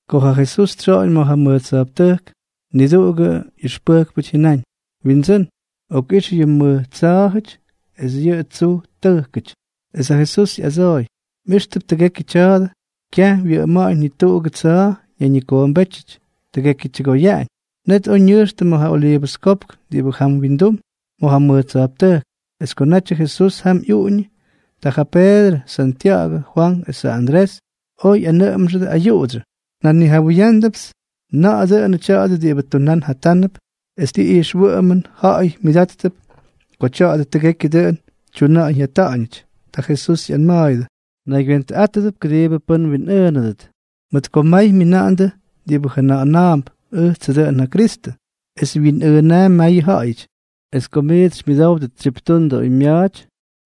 Ko ja Jesús tsyoꞌoñ ma̱ ja mʉj tsa̱jptʉjk, niduꞌugʉ ꞌyʉxpʉjkpʉty jyʉnáñ: —Windsʉ́n, okꞌix yʉ mʉj tsa̱a̱jʉty es yʉ tsuj tʉjkʉty. Es ja Jesús ꞌyadsooy: —¿Mꞌijxtʉp tʉgekyʉ tya̱a̱dʉ? Kyaj wyʉꞌʉma̱ꞌa̱ñ ni tuꞌugʉ tsa̱a̱ ñayñikoombétyʉty, tʉgekyʉ tyʉgoyaꞌañ. Net oj ñʉjxtʉ ma̱ ja Oliivʉs Kopk diꞌibʉ jam windum ma̱ ja mʉj tsa̱jptʉjk. Es ko natyʉ Jesús jam ꞌyuꞌuñʉ, ta ja Peedrʉ, Santya̱ꞌa̱gʉ, Fwank esʉ Andrés oj ꞌyanʉꞌʉmxʉdʉ ayuꞌudsyʉ: —Njanijawʉyándʉpts na̱ꞌa̱ dʉnʉ tya̱a̱dʉ diꞌibʉ tunán jatánʉp es ti ijxwʉꞌʉmʉn ja̱ꞌa̱y myʉdáttʉp ko tya̱a̱dʉ tʉgekyʉ dʉꞌʉn tyuna̱ꞌa̱ñ jyata̱ꞌa̱ñʉty. Ta Jesús ꞌyanma̱a̱yʉdʉ: —Mnaygywentʉꞌátʉdʉp kʉdiibʉ pʉ́n mwinꞌʉʉnʉdʉt. Mʉt ko may myina̱ꞌa̱ndʉ diꞌibʉ jʉna̱ꞌa̱na̱a̱mp: “Ʉjtsʉ dʉꞌʉn ja Kristʉ.” Es wyinꞌʉʉnaampy mayʉ ja̱ꞌa̱yʉty. ’Es ko miits xymyʉdówdʉt tsyiptundʉ oymya̱a̱ty,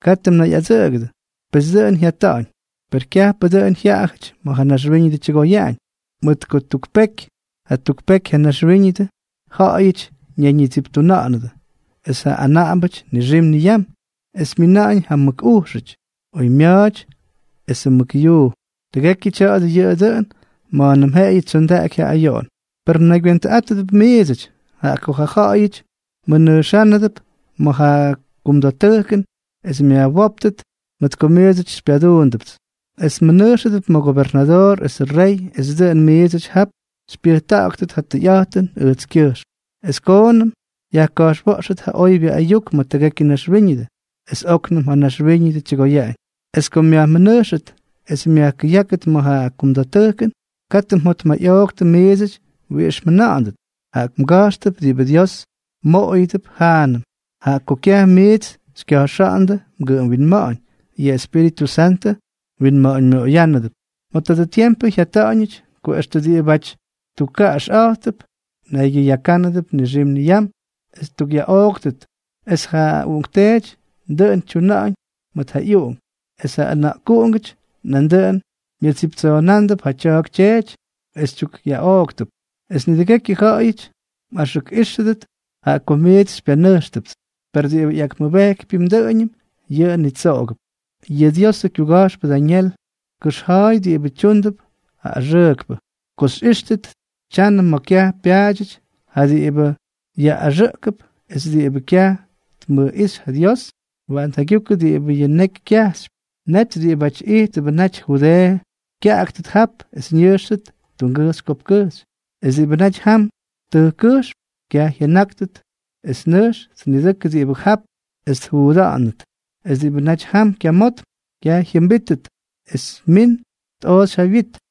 katʉ mnayꞌadsʉꞌʉgʉdʉ. Pes dʉꞌʉn jyata̱ꞌa̱ñ, per kyajpʉ dʉꞌʉn yʉꞌʉjʉty ma̱ ja naxwíñʉdʉ tyʉgoyaꞌañ. Mʉt ko tuk peky mʉt jatuk peky ja naxwíñʉdʉ ja̱ꞌa̱yʉty ñayñitsiptuna̱ꞌa̱nʉdʉ esʉ anaꞌambʉty nixim niyam, es myina̱ꞌa̱ñ ja mʉk ujxʉty oymya̱a̱ty esʉ mʉk yuu. Tʉgekyʉ tya̱a̱dʉ yʉꞌʉ dʉꞌʉn ma̱a̱nʉm jeꞌeyʉ tsyondaꞌaky ja ayoꞌon. ’Per mnaygywentʉꞌátʉdʉp miidsʉty, jaꞌa ko ja ja̱ꞌa̱yʉty mmʉnʉjxʉdʉp ma̱ ja kumda̱ttʉjkʉn es myajwóptʉt mʉt ko miits xypyanʉjxtʉpts. Es mmʉnʉjxʉdʉp ma̱ gobernadoor esʉ rey es dʉꞌʉn miidsʉty jap xypyʉjta̱ꞌa̱ktʉt ja tʉyꞌa̱jtʉn ʉjtskyʉjxm. Es koonʉm yajka̱jxwa̱ꞌxʉt ja oybyʉ ayuk ma̱ tʉgekyʉ naxwíñʉdʉ, es óknʉm ja naxwíñʉdʉ tyʉgoyaꞌañ. Es ko myajmʉnʉjxʉt es myajkʉyákʉt ma̱ ja kumda̱ttʉjkʉn, katʉ mjotmayꞌooktʉ miidsʉty wiꞌix mjʉna̱ꞌa̱ndʉt. Jaꞌa mga̱jxtʉp diꞌibʉ Dios mmoꞌoyʉdʉp jaanʉm, jaꞌa ko kyaj miits xykya̱jxa̱ꞌa̱ndʉ mgʉꞌʉm winma̱ꞌa̱ñ, yʉ Espíritʉ Santʉ mwinma̱ꞌa̱ñmyoꞌoyʉdʉp. ’Ma̱ tadʉ tiempʉ jyata̱ꞌa̱ñʉty, ko extʉ diꞌibáty tukkaꞌaxꞌa̱jttʉp kyʉyaka̱ꞌa̱nʉp nixim niyam es ttukꞌyaꞌooktʉt; es ja uꞌunkteety dʉꞌʉn tyuna̱ꞌa̱ñ mʉt ja ꞌyuꞌunk; es ja ʉna̱ꞌkuꞌungʉty nandʉꞌʉn myʉttsiptuna̱ꞌa̱ndʉp ja tya̱a̱k tyeety es tyukꞌyaꞌooktʉp. Es nidʉgekyʉ ja̱ꞌa̱yʉty mꞌaxʉkꞌíxʉdʉt jaꞌa ko miits xypyanʉjxtʉpts. Per diꞌibʉ ꞌyakmʉbejkypyʉm dʉꞌʉñʉm, yʉꞌʉ nitsoꞌogʉp. ’Yʉ Diosʉ kyuga̱jxpʉ Dañel tkʉxja̱a̱y diꞌibʉ tyúndʉp ja axʉʉkpʉ. Ko xyꞌíxtʉt tyanʉ ma̱ kyaj pyaadyʉty ja diꞌibʉ yaꞌꞌaxʉꞌkʉp es diꞌibʉ kyaj tmʉjꞌíxy ja Dios (waꞌan tjaygyukʉ diꞌibʉ yʉ neky kyajxypy), net diꞌibáty ijttʉbʉ naty Judeeʉ kyaꞌaktʉt jap es ñʉjxtʉt tungʉjxy kopkkʉjxy. Es diꞌibʉ naty jam tʉjkkʉjxm, kyaj jyʉnákʉt es nʉjx tnidʉkʉ diꞌibʉ jap es tjuuda̱ꞌa̱nʉt. Es diꞌibʉ naty jam kyamotm, kyaj jyʉmbítʉt es min tꞌooxy ja wyit.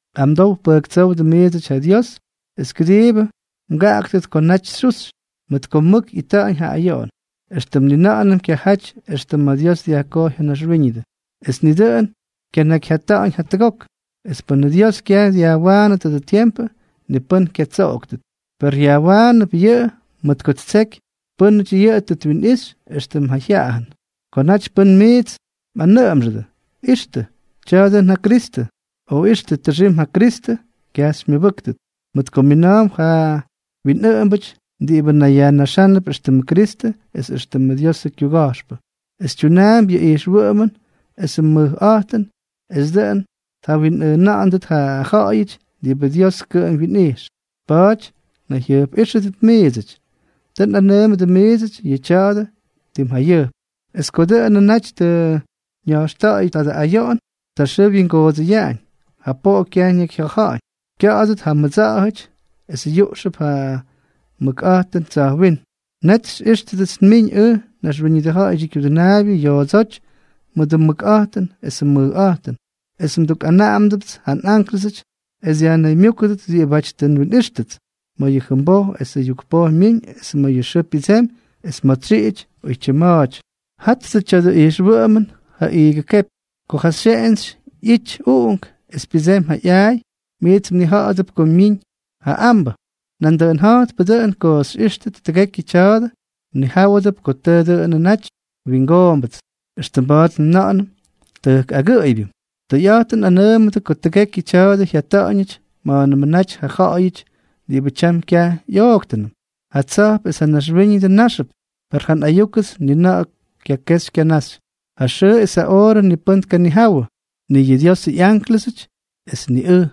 Amdow pʉjktsówdʉ miidsʉty ja Dios es kʉdiibʉ mgaꞌaktʉt ko naty xyuxy, mʉt ko mʉk ꞌyita̱ꞌa̱ñ ja ayoꞌon, éxtʉm ni na̱ꞌa̱nʉm kyajaty extʉ ma̱ Dios dyajkojy ja naxwíñʉdʉ, es ni dʉꞌʉn kyanakyjyata̱ꞌa̱ñʉty jatʉgok. Es pʉnʉ Dios kyaj dyajwaanʉ tadʉ tiempʉ, ni pʉ́n kyatsoꞌoktʉt. Per yajwaanʉp yʉꞌʉ mʉt ko ttseky pʉ́nʉty yʉꞌʉ tʉ twinꞌixy éxtʉmʉ jyaꞌayʉn. ’Ko naty pʉ́n miits mꞌanʉꞌʉmxʉdʉ: “Ixtʉ, tya̱a̱ dʉn ja Kristʉ”, o “Ixtʉ, tʉxim ja Kristʉ”, kyaj xymyʉbʉ́ktʉt. Mʉt ko mina̱a̱mp ja winꞌʉꞌʉmbʉty diꞌibʉ nayyajnaxánʉp éxtʉmʉ Kristʉ es éxtʉmʉ Diosʉ kyuga̱jxpʉ, es tyunaampy yʉ ijxwʉꞌʉmʉn esʉ mʉjꞌa̱jtʉn es dʉꞌʉn tjawinꞌʉʉna̱ꞌa̱ndʉt ja ja̱ꞌa̱yʉty diꞌibʉ Dios kʉꞌʉm wyinꞌijx. Pa̱a̱ty mnayjyʉjpꞌíxʉdʉp miidsʉty. Tʉ nꞌanʉʉmʉdʉ miidsʉty yʉ tya̱a̱dʉ tim jayʉjp. ’Es ko dʉꞌʉnʉ naty tʉ ña̱jxta̱ꞌa̱yʉ tadʉ ayoꞌon, ja xʉʉ wyingoodsʉyaꞌañ, ja poꞌo kyaj ñakyjya̱ja̱ꞌa̱ñ, kya̱ꞌa̱dʉt ja mʉdsa̱ꞌa̱jʉty es yuꞌxʉp ja mʉkꞌa̱jtʉn tsa̱jwínm. Net xyꞌíxtʉdʉts nmiñ ʉj, ja Naxwíñʉdʉ Ja̱ꞌa̱yʉdyʉ Kyudʉnaabyʉ, yoodsóty mʉdʉ mʉkꞌa̱jtʉn esʉ mʉjꞌa̱jtʉn. Es ndukꞌanaꞌamʉdʉts ja nꞌánklʉsʉts, es dyajnaymyúkʉdʉt diꞌibáty tʉ nwinꞌíxtʉts, ma̱ yʉ jʉmboj esʉ yukpoj myiñ es ma̱ yʉ xʉʉ pyʉdsemy es ma̱ tsyiꞌity, oytyim ma̱a̱ty. ’Jattʉ tya̱dʉ ꞌyijxwʉꞌʉmʉn ja iigʉ kepy. Ko ja xyeꞌentsy ꞌyity uꞌunk es pyʉdsemy ja ꞌyaay, miits mnija̱ꞌa̱dʉp ko miimp ja ambʉ. Nandʉꞌʉn ja̱jtpʉ dʉꞌʉn ko xyꞌíxtʉt tʉgekyʉ tya̱a̱dʉ, mnijáwʉdʉp ko tʉʉ dʉnʉ naty wingoombʉts, éxtʉm mba̱a̱t njʉna̱ꞌa̱nʉm tʉjk agʉꞌʉybyʉn. Tʉyꞌa̱jtʉn nꞌanʉʉmʉdʉ ko tʉgekyʉ tya̱a̱dʉ jyata̱ꞌa̱ñʉty ma̱a̱nʉmʉ naty ja ja̱ꞌa̱yʉty diꞌibʉ tyam kyaj ꞌyooktʉnʉm. Ja tsa̱jp es ja naxwíñʉdʉ náxʉp, per ja nꞌayúkʉts ni na̱ꞌa̱ kyakexy kyanaxy. ’Ja xʉʉ es ja oorʉ ni pʉ́n tkanijawʉ, ni yʉ Diosʉ ꞌyánklʉsʉty es ni ʉj,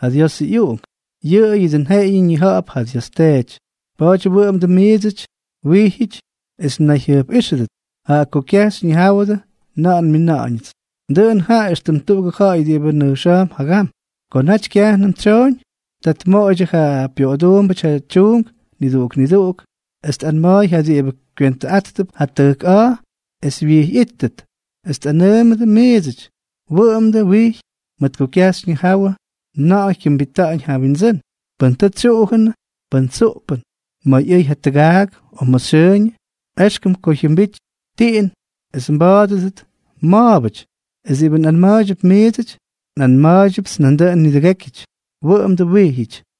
ja Diosʉ ꞌyUꞌunk, yʉꞌʉyʉ dʉꞌʉn jeꞌeyʉ ñija̱ꞌa̱p ja Dios Teety. Pa̱a̱ty wʉꞌʉmdʉ miidsʉty wijyʉty es mnayjyʉjpꞌíxʉdʉp, jaꞌa ko kyaj xyñijáwʉdʉ na̱ꞌa̱ nmina̱ꞌa̱ñʉts. ’Dʉꞌʉn jaꞌa éxtʉm tuꞌugʉ ja̱ꞌa̱y diꞌibʉ nʉjxa̱a̱mp jagam. Ko naty kyajnʉm tsyooñ, ta tmoꞌoydyʉ ja pyoꞌoduumbʉty ja tyuunk niduꞌuk niduꞌuk, es tꞌanma̱a̱y ja diꞌibʉ kywentʉꞌátʉp ja tʉjk a̱a̱ es wyijyꞌítʉt. Es nꞌanʉʉmʉdʉ miidsʉty, wʉꞌʉmdʉ wijy, mʉt ko kyaj xyñijáwʉdʉ na̱ꞌa̱ jyʉmbita̱ꞌa̱ñ ja mWindsʉ́n, pʉn tʉ tsyuꞌujʉnʉ, pʉn tsuꞌpʉn, ma̱ ꞌyʉy ja tʉgaak o ma̱ xyʉʉñʉ. Exkʉm ko jyʉmbity tiꞌin es mba̱a̱dʉdʉt ma̱a̱bʉty. Es diꞌibʉ nꞌanma̱a̱ydyʉp miidsʉty, nꞌanma̱a̱ydyʉpts nandʉꞌʉn nidʉgékyʉty: Wʉꞌʉmdʉ wijyʉty.